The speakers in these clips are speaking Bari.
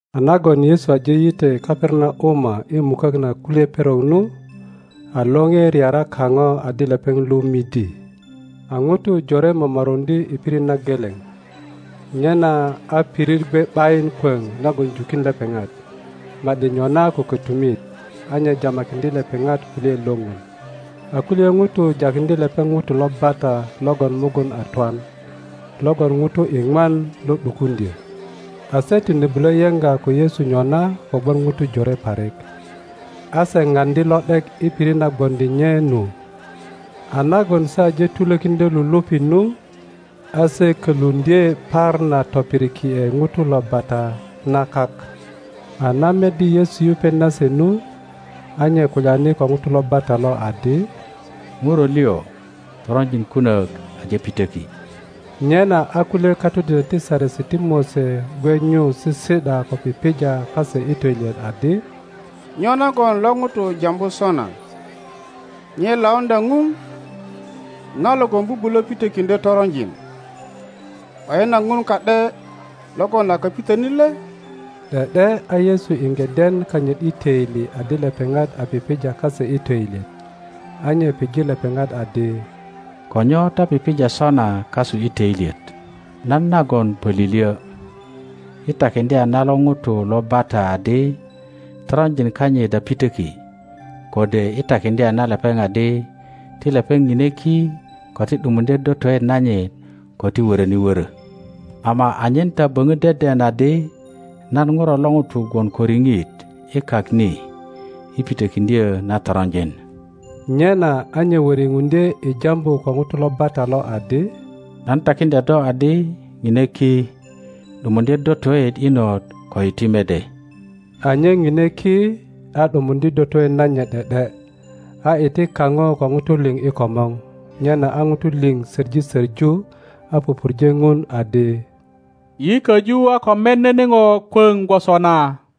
A nagon Yesu aje yitwe Kaperanauma i mukök na kulye perok nu, a lore reara kaŋo adi lepeŋ lu midi. A ŋutu jore momoruŋdye i pirit na geleŋ, nyena a pirit gwe ’bayin kwoŋ nagon jukin lepeŋat, ma ’di nyona ko kötumit; a nye jamakiŋdye lepeŋat kulyaet lo Ŋun. A kulye ŋutu jakiŋdye lepeŋ ŋuto lo bata logon mugun a twan, logon ŋutu iŋwan lo ’dukuŋdyö. A se tine bulo yeŋga ko Yesu nyona kogwon ŋutu jore parik. A se paŋdi lo ’dek i pirit na gwoŋdi nye nu. A nagon se aje tulokiŋdyö lulupi nu, a se köluŋdye par na topiriki ’e ŋuto lo bata na kak. a na meddi Yesu yupet nase nu, a nye kulyani ko ŋuto lo bata lo adi, Ŋuro lio, toronjin kunök aje pitöki. Nyena a kulye katodinök ti Saresi ti Mose gwe nyu sisi ’da ko pipija kase i töilyet adi, Nyo nagon lo ŋuto jambu sona? Nye lauŋdya Ŋun! Ŋa logon bubulö pitökiŋdyö toronjin? ’Bayin a Ŋun ka ’de logon a kapitönit le? ’De ’de a Yesu iŋge den kanyit i töili adi lepeŋat a pipija kase i töilyet, a nye pije lepeŋat adi, Ko nyo ta pipija sona kasu i töilyet? Nan nagon pölilyo, i takindya na lo ŋuto lo bata adi toronjin kanyit a pitöki, kode i takindya na lepeŋ adi, ti lepeŋ ŋine ki ko ti ’dumundye dotoet nanyit ko ti wöröni wörö? Ama anyen ta böŋö deden adi nan Ŋuro lo ŋuto gwon ko riŋit i kak ni i pitökindyö na toronjin—nyena a nye woripuŋdye i jambu ko ŋuto lo bata lo adi— Nan takindya do adi, Ŋine ki, ’dumundye dotoet inot ko iti mede. A nye ŋine ki, a ’dumundye dotoet nanyit ’de ’de, a iti kaŋo ko ŋutu liŋ i komor; nyena a ŋutu liŋ söŋi söŋu, a pupurje Ŋun adi, Yi koju a ko met nene ŋo kwöŋ gwoso na!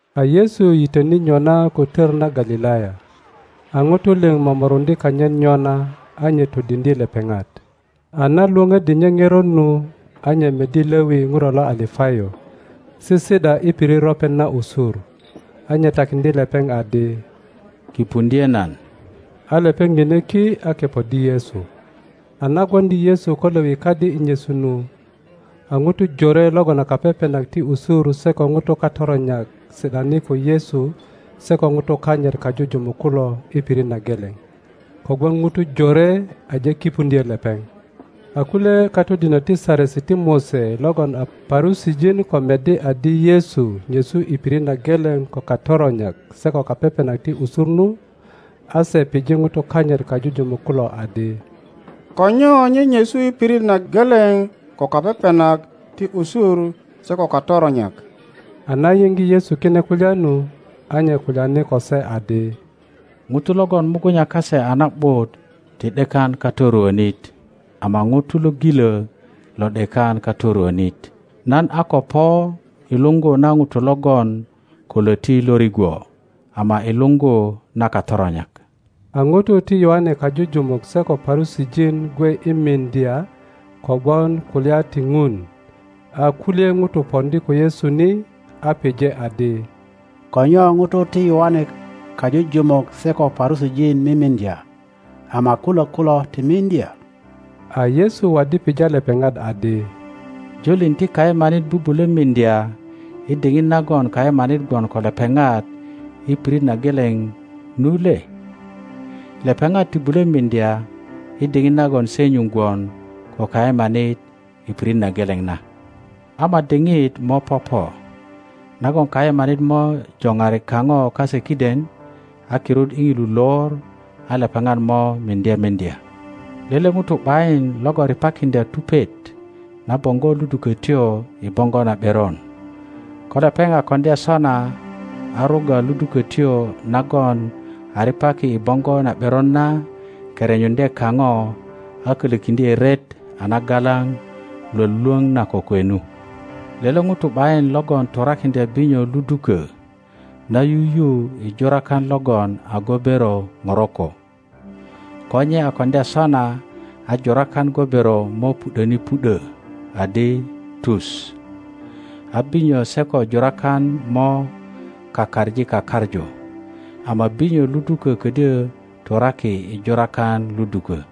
A Yesu yitöni nyona ko tör na Galilaya; a ŋutu liŋ momorundye kanyit nyona, a nye todindye lepeŋat. A na Iwoŋöddi nye ŋerot nu, a nye meddi Lewi Ŋuro lo Alapayo, sisi ’da i pirit ropet na usur, a nye takindye lepeŋ adi, Kipundye nan. A lepeŋ ŋine ki a kepoddi Yesu. A na gwondi Yesu ko Lewi kadi i nyesu nu, a ŋutu jore logon a kapepenak ti usur se ko ŋutu katoronyak si ’dani ko Yesu se ko ŋutu kanyit kajujumuk kulo i pirit na geleŋ; kogwon ŋutu jore aje kipundyo lepeŋ. A kulye katodinök ti Saresi ti Mose logon a Parusijin ko meddi adi Yesu nyesu i pirit na geleŋ ko katoronyak se ko kapepenak ti usur nu, a se pije ŋutu kanyit kajujumuk kulo adi, Ko nyo nye nyesu i pirit na geleŋ ko kapepenak ti usur se ko katoronyak? A na yiŋge Yesu kine kulya nu, a nye kulyani ko se adi, ŋutu logon mugunya kase a na ’but ti ’dekan katoruönit, ama ŋutu lo gilö lo ’dekan katoruonit; nan a ko po i luŋgu na ŋutu logon ko löti lo rigwo ama i luŋgu na katoronyak. A ŋutu ti Yoane kajujumuk se ko Parusijin gwe i mindya kogwon kulya ti Ŋun; a kulye ŋutu pondi ko Yesu ni, a pije adi, Ko nyo ŋutu ti Yoane kajujumuk se ko Parusijin mimindya, ama kulok kulo ti mindya? A Yesu waddi pija lepeŋat adi, Julin ti kayemanit bubulö mindya i diŋit nagon kayemanit gwon ko lepeŋat i pirit na geleŋ nu le? Lepeŋat ti bulö miŋdya i diŋit nagon se nyuŋ gwon ko kayemanit i pirit na geleŋ na. Ama diŋit mo popo nagon kayemanit mo joŋari kaŋo kase kiden, a kirut i ŋilu lor a lepeŋat mo miŋdye miŋdya. Lele ŋuto ’bayin logon ripakiŋdya tupet na boŋgo ludukötyo i boŋgo na ’beron; ko lepeŋ a koŋdya sona a rugga ludukötyo nagon a ripaki i boŋgo na ’beron na kerenyuŋdye kaŋo a kölökiŋdye ret a nagalaŋ lwölwoŋ na kokwe nu. Lele ŋuto ’bayin logon turakiŋdya binyo ludukö na yuyu i jurakan logon a gobero ŋoroko; ko nye a koŋdya sona a jurakan gobero mo pu ’döni pu ’dö adi tu, a binyo se ko jurakan mo kakaŋi kakaŋu; ama binyo ludukö ködyö turaki i jurakan ludukö.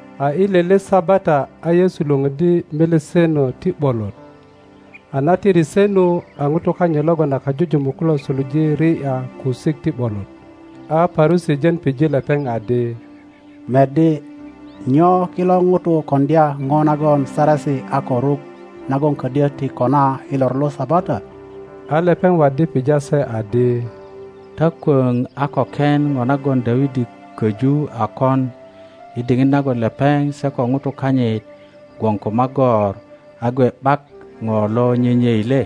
A i lele Sabata a Yesu Iwoŋöddi meleseno ti ’bolot; a na tiri se nu, a ŋutu kanyit logon a kajujumuk kulo suluje Ti ’ya kusik ti ’bolot. A Parusijin pije lepeŋ adi, Meddi, nyo kilo ŋutu koŋdya ŋo nagon saresi a ko ruk nagon ködyö ti kona i lor lo Sabata? a lepeŋ waddi pija se adi, Ta kwöŋ a ko ken ŋo nagon Dawidi köju a kon i diŋit nagon lepeŋ se ko ŋutu kanyit gwon ko magor a gwe ’bak ŋo lo nyenyei le?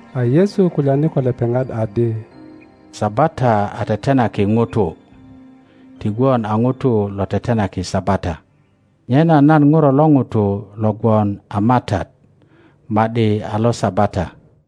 A Yesu kulyani ko lepeŋat adi, Sabata a tetenaki ŋutu, ti gwon a ŋutu lo tetenaki Sabata; nyena nan Ŋuro lo ŋuto lo gwon a matat ma ’di a lo Sabata.